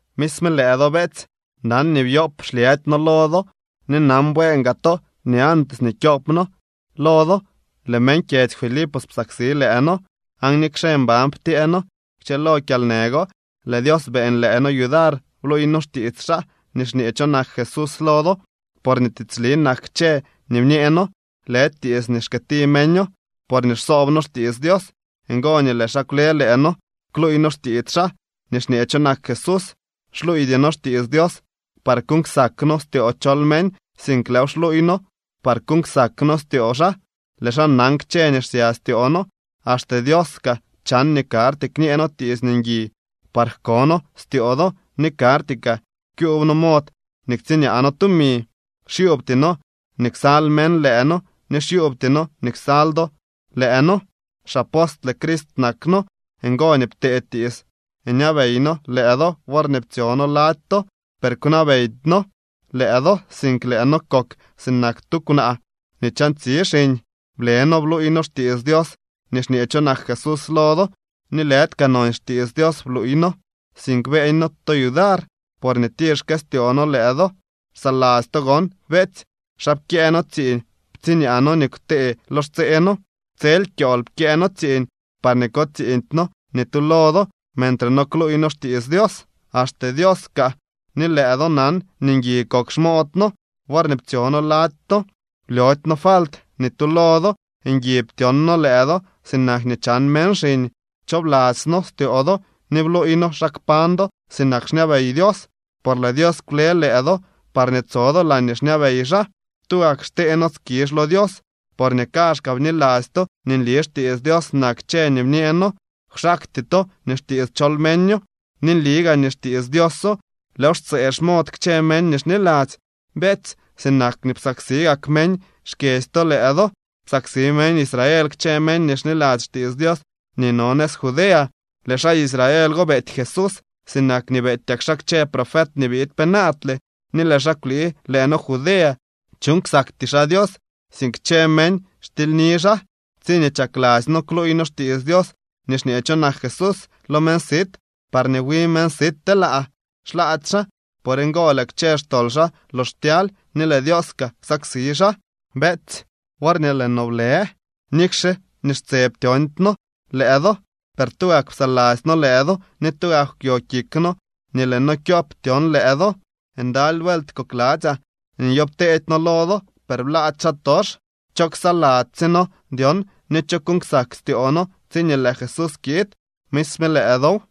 Misme lëë do, beetsy, nan nii byoob xlyëdy noo lo do. Ni nan bueen gaa to nii antes nii kyoop no lo do lëë meñ kyedzy Filipos psaksi lëë noo, aan nikxe mban ptyee noo kchëlo kyalnë go, lëë Dios beeñ lëë noo yudar bluuy noo xtiits xaa nii xñee cho nak Jesús lo do. Porñee tiitsli nak kchë nii bñee noo, lëdy tiits nii xkëëti meño. Porñee xsoob noo xtiits Dios, ngo nii lëë xaa kwle lëë noo kluuy noo xtiits xaa nii xñee cho nak Jesús. Xluuydy noo xtiits Dios par kuuñ ksak noo styoo chol meñ, sink lëëw xluuy noo par kuuñ ksak noo styoo xaa. Lëë xaa nan kchë nii xsya styoo noo. Axte Dios kaa chan nii karty kñee noo tiits ngui par jko noo styoo do ni karty kaa kyuub noo mod nii ktsiñaa noo tumi. Xyuubty noo nii ksal meñ lëë noo ni xyuubty noo nii ksal do lëë noo. Xapostle Crist nak noo, ngo nii ptee tiits ñabey noo lëë do worñee ptsyo noo lady to, per kwnabeydy noo lëë do, sink lëë noo kok sinak tu kwnaa nii chantsi xiñ. Ble noo bluuy noo xtiits Dios nii xñee cho nak Jesús lo do, ni lëdy kaa nonsy xtiits Dios bluuy noo, sink beeñ noo to yudar porñee tir xkëstyoo noo lëë do. Xsaladzy to gon, beetsy, xa pkyëë noo tsiiñ, ptsiñaa noo nii kwte lo xtsee noo. Tsel kyool pkyëë noo tsiiñ parñee ko tsiiñdy noo ni tu lo do mentre no kluuy noo xtiits Dios. Axte Dios kaa ni lëë do nan nii ngui kok xmood noo worñee ptsyo noo lady to, blyody noo falt ni tu lo do. Ngui ptyon noo lëë do sinak nii chan meñ xiñ. Pchoobladzy noo styoo do ni bluuy noo xa kpañ do sinak xñabey Dios, por lëë Dios kwle lëë do parñee tso do laañee xñabey xaa. Tugak xtee noo skizh lo Dios, porñee kaazhkaa bniladzy to nii nli xtiits Dios nak kchë nii bñee noo, kwxaakty to nii xtiits chol meño. Ni nli gaa nii xtiits Dioso. Lëëw xtsëë xmod kchë meñ nii xniladzy. Beetsy, sinak nii psaksi gak meñ xkyedzy to lëë do, psaksi meñ Israel kchë meñ nii xniladzy xtiits Dios nii no nëz Judea. Lëë xaa Israel go beety Jesús, sinak nii beetyak xaa kchë profet nii biid penaadle, ni lëë xaa kwlii lëë noo Judea. Chuuñ ksakty xaa Dios, sink kchë meñ xtilyni xaa. Tsiñee chakladzy noo kluuy noo xtiits Dios nii xñee cho nak Jesús lo meñ sit parñee wi meñ sit telaa, xlaady xaa. Por ngo lëë kchë xtol xaa lox ptyaly, ni lëë Dios kaa ksaksi xaa. Beetsy, worñee lëë no blë, nikxe nii xtse ptyoondy noo lëë do, per tugak psaladzy noo lëë do ni tugak kwyo kik noo nii lëë noo kyop tyon lëë do. Ndaly vuelt kokladzyaa nii nyoopteedy noo lo do, per blaady xaatox. ¿Cho ksaladzy sye noo dyon ni cho kuuñ ksak styoo noo tsiñee lëë Jesús kiid? Misme lëë dow.